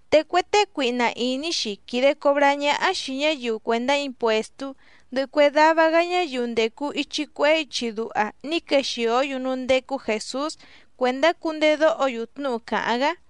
Te cue tée cuihna ìní‑xi quìde cobrá ñáhá xìi ñáyiu cuèndá impuèstú ndɨhɨ cue dava‑gá ñáyiu ndècu ichi cuehé ichi duha ní quexìó‑yu núú ndécú Jèsús cuèndá cundedóho‑yu tnúhu càháⁿ‑gá.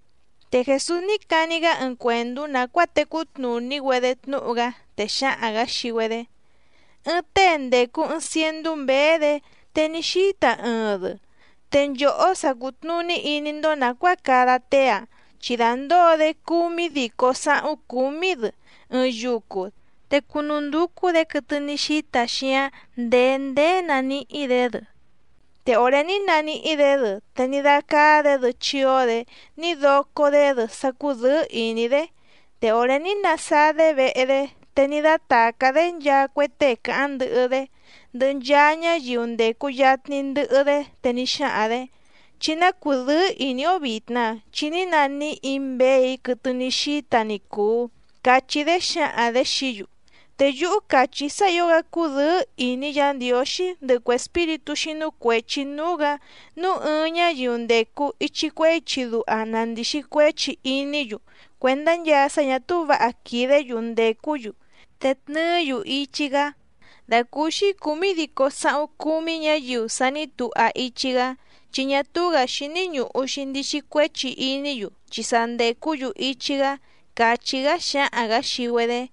Te Jèsús ní cani‑gá ɨɨⁿ cuèndú nàcuáa tecú tnùní‑güedé tnúhu‑gá, te xáhaⁿ‑gǎ xii‑güedé: —Ɨɨⁿ tée ndècu ɨɨⁿ ciendú mběé‑dě, te ní xíta ɨɨⁿ‑dɨ, te nchòhó sa cùtnuní iní‑ndó nàcuáa cada tée‑áⁿ, chi dàndóo‑dé cúmídícó sǎhúⁿ cúmí‑dɨ ɨɨⁿ yucu, te cúnúndúcú‑dě quɨtɨ ní xíta xíǎⁿ ndèé ndéé naníhí‑dě‑dɨ. Te òré ní naníhí‑dě‑dɨ te ní dácáá‑dě‑dɨ chíó‑dě ní docó‑dé‑dɨ sá cúdɨ̌ɨ́ ìní‑dé. Te òré ní nasáá‑dé vehe‑dé, te ní dátàcá‑dé nchaa cue tée càháⁿ ndɨhɨ‑dé, ndɨhɨ nchaa ñáyiu ndècu yatni ndɨhɨ‑dé, te ní xáhaⁿ‑dě: “Chí ná cùdɨ́ɨ́ ìní‑ó vìtna, chi ní naníhì‑í mběè‑í quɨtɨ ní xíta ni cùu”, cachí‑dé xǎhaⁿ‑dě xií‑yu. Te yúhú càchí‑í sá ǐo‑gá cúdɨ̌ɨ́ ìní Yǎ Ndiǒxí ndɨhɨ cue espíritú xínú cuèchi núú‑gǎ nǔu ɨɨⁿ ñáyiu ndècu ichi cuehé ichi duha na ndìxi cuéchi iní‑yu cuèndá nchaa sá ñà túú vǎha quìdé‑yu ndècú‑yu te tnɨɨ́‑yu ichi‑gá, dàcúúxí cǔmídícó sǎhúⁿ cúmí ñǎyiu sa ní tuha ichi‑gá, chi ñá túú‑gǎ xíní ñùhu‑xi ndixi cuéchi iní‑yu chi sa ndècú‑yu ichi‑gá —càchí‑gá xáhaⁿ‑gǎ xii‑güedé.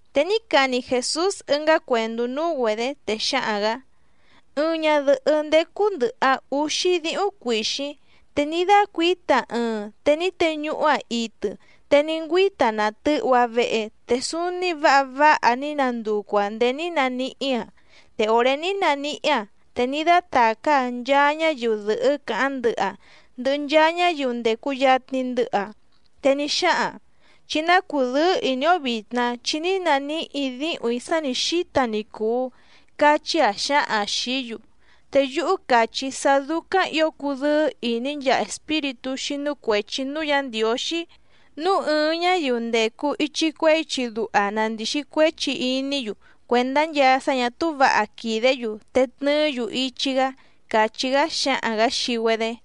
Te ní cani Jèsús ɨngá cuèndú núú‑güedě, te xáhaⁿ‑gǎ: —Ɨɨⁿ ñadɨ̀hɨ́ ndécú ndɨ̀hɨ‑aⁿ úxí díhúⁿ cuìxíⁿ, te ní dácuǐta‑aⁿ ɨɨⁿ te ní teñuhú‑aⁿ itɨ, te ní ngüíta‑aⁿ nàtɨhu‑aⁿ vehe, te súúní vǎha vǎha ní nanducu‑aⁿ nděé ní naníhí‑aⁿ. Te òré ní naníhí‑aⁿ, te ní dátàcá‑aⁿ nchaa ñáyiu dɨ̀hɨ́ càháⁿ ndɨhɨ‑aⁿ ndɨhɨ nchaa ñáyiu ndècu yatni ndɨhɨ‑aⁿ, te ní xáhaⁿ‑aⁿ: “Chí ná cùdɨ́ɨ́ ìní‑ó vìtna chi ní naníhì‑í díhùⁿ‑í sá nǐ xíta ni cùu”, cachí‑aⁿ xǎhaⁿ‑aⁿ xìí‑yu. Te yúhú càchí‑í sá dúcáⁿ ǐo cùdɨ́ɨ́ ìní nchaa espíritú xínú cuèchi núú Yǎ Ndiǒxí, núu ɨɨⁿ ñáyiu ndècu ichi cuehé ichi duha na ndìxi cuéchi iní‑yu cuèndá nchaa sá ñà túú vǎha quìdé‑yu, te tnɨɨ́‑yu ichi‑gá —càchí‑gá xáhaⁿ‑gǎ xii‑güedé.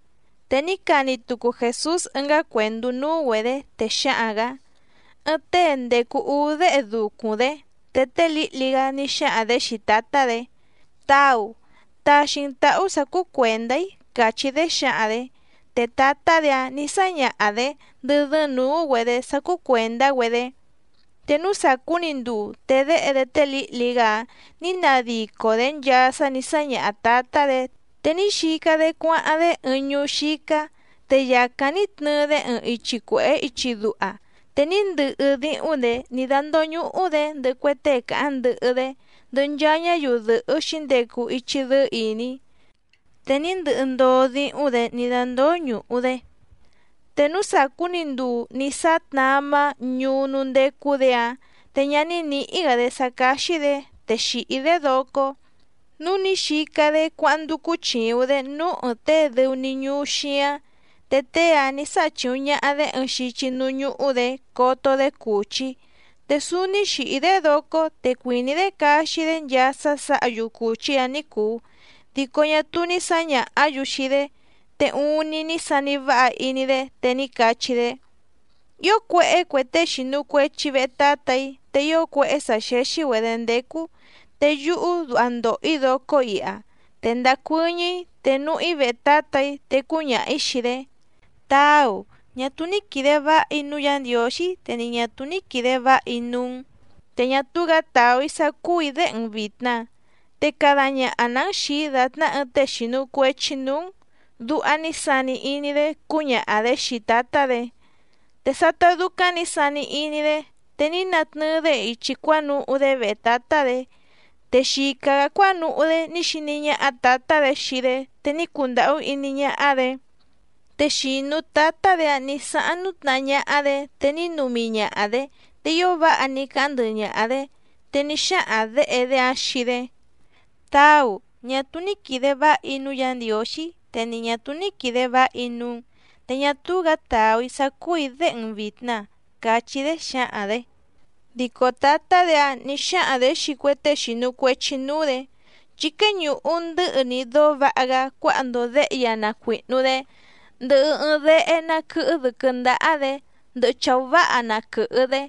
Te ní cani tucu Jèsús ɨngá cuèndú núú‑güedě, te xáhaⁿ‑gǎ: —Ɨɨⁿ tée ndècu úú déhe ducuⁿ‑dé, te tée lǐhli‑gá ní xáhaⁿ‑dě xii tǎtá‑dě: “Táu, taxi‑n tǎhú sǎ cúú cuèndá‑í”, càchí‑dé xǎhaⁿ‑dě. Te tǎtá‑dě‑áⁿ nǐ sáñaha‑dě ndɨ́ dɨ́ɨ́ⁿ nǔú‑güedě sá cúú cuèndá‑güedé. Te núú sàcú‑ni nduu, te déhe‑dé tée lǐhli‑gá‑áⁿ nǐ nadico‑dě nchaa sá nǐ sáñaha tǎtá‑dě, te ní xica‑dé cuáháⁿ‑dé ɨɨⁿ ñuú xícá, te yàcáⁿ ní tnɨɨ‑dé ɨɨⁿ ichi cuèhé ichi duha, te ní ndɨhɨ díhúⁿ‑dě ní dándóñùhu‑dé ndɨhɨ cue tée càháⁿ ndɨhɨ‑dé, ndɨhɨ nchaa ñáyiu dɨ̀hɨ́ xǐndecu ichi dɨ́ɨ́ ìní. Te ní ndɨhɨ ndoo díhúⁿ‑dě ní dándóñùhu‑dé, te núú sàcú‑ni nduu ní sáá tnamá ñuú núú ndécú‑dě‑áⁿ, te ñá nìhí‑gá‑dé sá cáxí‑dě, te xìhí‑dé docó. Núu ní xica‑dé cuáháⁿ ndúcú chìuⁿ‑dé núú ɨ̀ɨⁿ tée dɨu‑ni ñuú xíáⁿ, te tée‑áⁿ nǐ sáha chìuⁿ ñaha‑dé ɨɨⁿ xichi núú ñúhú‑dě coto‑dé cùchí. Te súúní xìhí‑dé docó te cuìní‑dé caxi‑dé nchaa sá sǎha‑yu cùchí‑áⁿ ní cùu, dico ñá túú ní sǎñàhá‑yu xii‑dé. Te uuⁿni ní sani váha iní‑dé, te ní cachí‑dé: “¡Ío cuéhé cue tée xìnu cuechi vehe tátà‑í te ío cuéhé sǎ xéxí‑güedě ndécú, te yúhú duha ndòho‑í docó iha! Te ndacuɨ́ñɨ́‑í te núhú‑í vehe tǎtà‑í, te cúñaha‑ǐ xii‑dé: Táu, ñá túú ní quìde váha‑í núú Yǎ Ndiǒxí te ni ñà túú ní quìde váha‑í núú‑n, te ñá túú‑gǎ tàú‑í sá cúù‑í déhe‑n vìtna, te cada ñaha‑nǎ‑n xìi‑í dàtná ɨɨⁿ tée xìnu cuechi núú‑n”, duha ní sani iní‑dé cúñaha‑dě xii tǎtá‑dě. Te sátá dúcáⁿ nǐ sani iní‑dé, te ní natnɨɨ‑dé ichi cuánuhú‑dé vehe tǎtá‑dě, te xica‑gǎ cuánuhú‑dé ní xiní ñáhá tǎtá‑dě xii‑dé te ní cundàhú iní ñáhá‑dě. Te xìnu tátá‑dě‑áⁿ nǐ sáháⁿ nútnahá ñáhá‑dě, te ní numi ñaha‑dě, te ío váha ní cáháⁿ ndɨhɨ ñaha‑dě. Te ní xáhaⁿ děhe‑dé‑áⁿ xii‑dé: “Táu, ñá túú ní quìde váha‑í núú Yǎ Ndiǒxí te ni ñà túú ní quìde váha‑í núú‑n, te ñá túú‑gǎ tàú‑í sá cúù‑í déhe‑n vìtna”, cachí‑dé xǎhaⁿ‑dě. ’Dico tǎtá‑dě‑áⁿ nǐ xáhaⁿ‑dě xii cue tée xìnu cuechi núú‑dě: “Chí quéñùhu ndɨ́hɨ‑ni dóó vǎha‑gá cuáha‑ndo děhe‑í‑a na cuìhnu‑dé, ndɨhɨ ɨɨⁿ dehé ná quɨ̀hɨ dɨ́quɨ́ ndáhá‑dě, ndɨhɨ chàú váha na quɨ̀hɨ‑dé.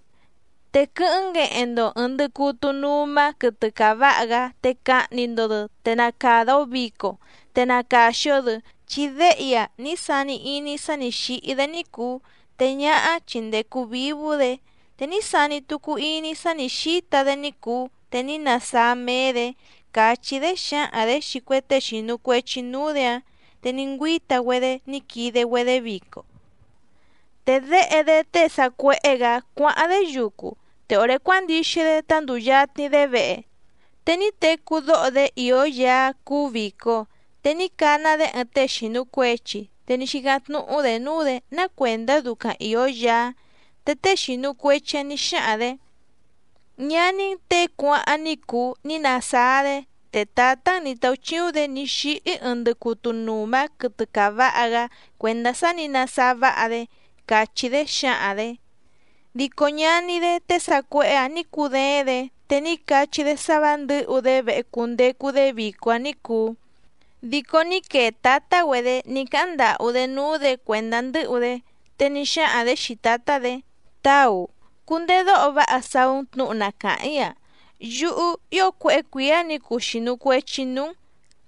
Te quɨ́hɨ́ⁿ ngueheⁿ‑ndo ɨ̀ɨⁿ ndɨcutu numa quɨtɨ caváha‑gá, te cahni‑ndo‑dɨ, te na càda‑o vico, te na càxi‑o‑dɨ. Chi déhe‑í‑a ní sani iní‑í sá nǐ xíhí‑dé ní cùu, te ñáhá chi ndècu vívú‑dě, te ní sani tucu iní‑í sá nǐ xíta‑dé ní cùu te ní nasáá méé‑dě”, càchí‑dé xǎhaⁿ‑dě xii cue tée xìnu cuechi núú‑dě‑áⁿ. Te ní ngüíta‑güedé ní quide‑güedé vico. ’Te déhe‑dé tée sàcuéhé‑gǎ cuáháⁿ‑dé yucu, te òré cuándixi‑dé tá ndùu yatni‑dé vehe, te ní tecú dóho‑dé ìó yaá cúú vìco. Te ní cana‑dé ɨɨⁿ tée xìnu cuechi, te ní xícáⁿ tnúhú‑dě núú‑dě ná cuèndá ducaⁿ ìó yaá. Te tée xìnu cuechi‑áⁿ nǐ xáhaⁿ‑dě: “Ñaní‑n těe cuáháⁿ ní cùu ní nasáá‑dé, te tǎtá‑n nǐ táúchíúⁿ‑dě ní xíhí ɨɨⁿ ndɨcutu nùma quɨtɨ caváha‑gá cuèndá sá nǐ nasáá váha‑dé”, càchí‑dé xǎhaⁿ‑dě. ’Dico ñaní‑dé tée sàcuéhé‑ǎⁿ nǐ cudééⁿ‑dě, te ní cachí‑dé sá vǎ ndɨ̌hu‑dé vehe cundecu‑dé vico‑áⁿ ní cùu, dico ní quee tǎtá‑güedě ní cáháⁿ ndàhú‑dé núú‑dě cuèndá ndɨ́hu‑dé. Te ní xáhaⁿ‑dě xii tǎtá‑dě: “Táu, cundedóho váha saú‑n tnǔhu na càháⁿ‑í‑a, yúhú ío cuéhé cuǐá nǐ cuu xìnu cuechi‑í núú‑n,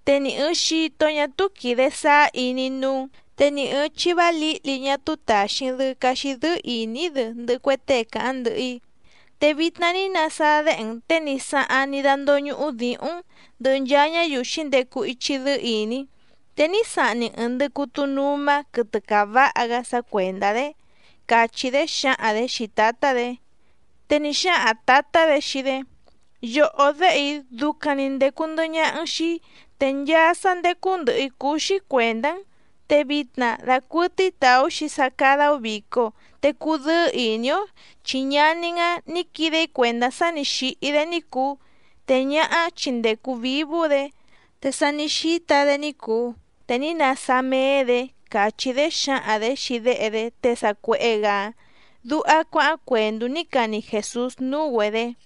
te ni ɨ̀ɨⁿ xito ñá túú quìde sáá iní‑í núú‑n, te ni ɨ̀ɨⁿ chivá lǐhli ñá túú tàxi‑n‑dɨ caxi dɨ́ɨ́ ìní‑í‑dɨ ndɨhɨ cue tée càháⁿ ndɨhɨ‑í. Te vitna ní nasáá déhe‑n těe ní sáháⁿ ní dándóñùhu díhúⁿ‑n ndɨhɨ nchaa ñáyiu xǐndecu ichi dɨ́ɨ́ ìní. Te ní sahni‑n ɨ̀ɨⁿ ndɨcutu numa quɨtɨ caváha‑gá sá cuèndá‑dé”, càchí‑dé xǎhaⁿ‑dě xii tǎtá‑dě. Te ní xáhaⁿ tǎtá‑dě xii‑dé: “Yòhó déhe‑í ducaⁿ‑ni ndècu ndɨhɨ ñaha‑n xii‑í, te nchaa sá ndécú ndɨ̀hɨ‑í cúú‑xí cuèndá‑n. Te vitna dacuɨtɨ́í tàú‑xi sá cádá‑ó vìco, te cudɨ́ɨ́ ìní‑ó, chi ñaní‑n‑áⁿ nǐ quide‑í cuèndá sá nì xíhí‑dé ní cùu, te ñáhá chi ndècu vívú‑dě, te sa ní xíta‑dé ní cùu, te ní nasáá méé‑dě”, càchí‑dé xǎhaⁿ‑dě xii déhe‑dé tée sàcuéhé‑gǎ‑áⁿ —duha cuáháⁿ cuèndú ní cani Jèsús núú‑güedě.